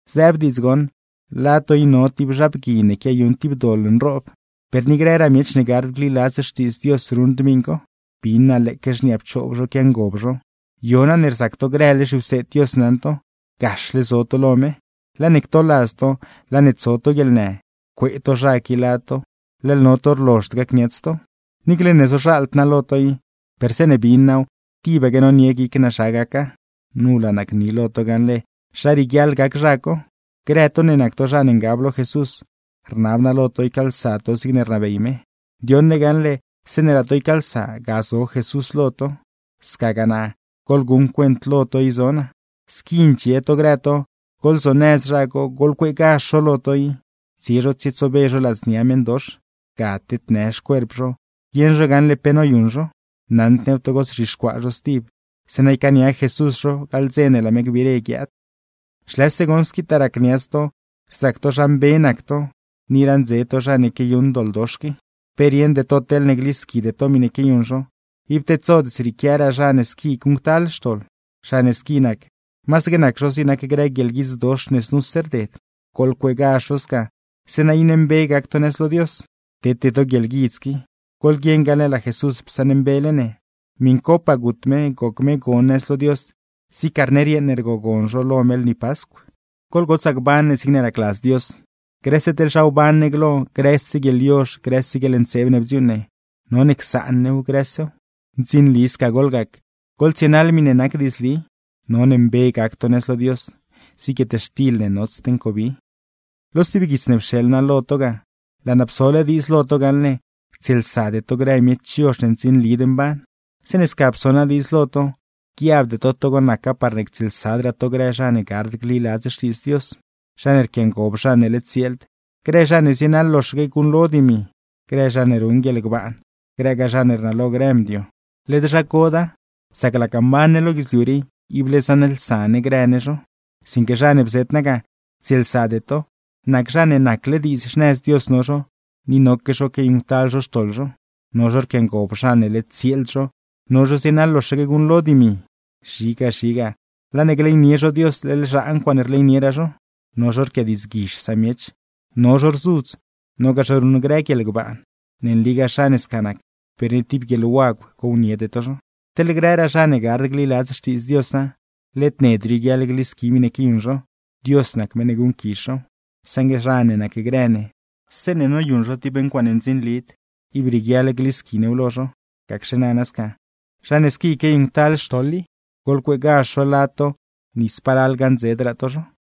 Zëëb diidz goṉ, lad to i no tib zha bgui ne quiayuṉ tib doḻ nroob; per ni grëraa miech ne gard gliladz Xtiidz Dios ruṉd miṉ co. Bin naa lëëque xniaa pchoob zho quiangob zho. ¡Yo na ne rzac to grële zhiwseed Dios naṉ to, gaxle zo to lo me! ¡Laa ne ctoladz to, laa ne tso to guieḻnë, cuee to zha qui lad to, leḻ no to rlozhd gacniats to! Niicle ne zozhaald naa lo to i, per zeeṉe bin naaw tibaque nonie guic naa zha gaca. Nu laa naa gni lo to gaṉle zha rieguiaḻ gac zha co: Grë to ne nac to zha ne ngab lo Jesús, rnab naa lo to ycaalsa to zigne rnabey me. Ndioṉle ne gaṉle zeeṉe laa to ycaalsa, ga zo Jesús lo to, scagaa naa, goḻguṉ cuent lo to i zo naa. Squi ndxie to grë to, goḻzonëz zha co, goḻcueegazh zho lo to i, tsie zho tsietsobe zho ladznia meṉdox, ga tednë xcuerp zho guieṉ zho gaṉle pe noyuṉ zho; naṉd new togo zzhixcuaa zho stib, zeeṉa ycaania Jesús zho gaḻ dze ne laa me gbiire guiaad. ¡Xlëse goṉ squitaa racniats to rzac to zha mbe nac to, ni raṉdze to zha ne quiayuṉ doḻdox qui! ¡Pe rieṉde to teḻne glisquide to miṉe quiayuṉ zho, ib tedsod zrieequiaraa zha ne squi guṉctal xtoḻ! Zha ne squi nac, masaque nac zho zig nac grë guieḻguidzdox ne znuse rded; goḻcueegazh zho sca, zeeṉa iṉe mbe gac to nëz lo Dios, tete to guieḻguidz qui. Goḻguieṉ gaṉle laa Jesús psaṉmbele ne, miṉcopaa gut me, goc me gon nëz lo Dios zig carner yeeṉ ne rgogon zho lo me lni Pascw. Goḻgotsaa gban ne zigne racladz Dios, grëse teḻ zha wban ne glo, grëse guieḻyozh, grëse guieḻntseeb ne bdziuuṉ ne, none csaan new grësew. Ndzinli sca goḻgac, goḻtsienaḻ miṉe nac diidzli; none mbe gac to nëz lo Dios, zig guietxtil ne notsd ncobi. Lo stib guits ne pxeḻ naa lo to ga, laa naa psole diidz lo to gaṉle ctsieelsade to grë miech yozh ne ndzinlid mban. Zeeṉe sca pso naa diidz lo to, guiabde to togo naca parne ctsieelsadraa to grë zha ne gard gliladz Xtiidz Dios, zha ne rquiangob zha ne led tsieeld, grë zha ne zienaḻ loxaque guṉlo dimi, grë zha ne ruṉ guieḻgbaan, grëgaa zha ne rnalo grë mdio. Led zha coda, sac laga mban ne lo guidzliu rii, ible zaṉlsa ne grë ne zho. Sinque zha ne bzet naa ga ctsieelsade to, nac zha ne nacle diidz xnëz Dios no zho, ni noque zho quiayuṉctal zho xtoḻ zho, no zho rquiangob zha ne led tsieeld zho, no zho zienaḻ loxaque guṉlo dimi, zhiga zhiga laa ne gleynie zho Dios leḻ zhaa ncuaaṉe rleynieraa zho, no zho rquiadiidzguizh samiech, no zho rzudz, nogaa zho ruṉ guieḻgbaan. Ne nligaa zha ne sca nac, per ni tib guieḻwagw gowniede to zho. Teḻ grëraa zha ne gard gliladz Xtiidz Diosa, led ned rioguiaḻ glisqui miṉe quiayuṉ zho, Dios nac meṉ ne guṉquizh zhow. Saṉgue zha ne nacgrë ne, zeeṉe noyuṉ zho tib ncuaaṉe ndzinlid, ib rieguiaḻ glisqui new lo zho. Gacxe nana sca, zha ne squi quiayuṉctal xtoḻ i, goḻcueegazh zho lad to, ni spalal gaṉdzedraa to zho.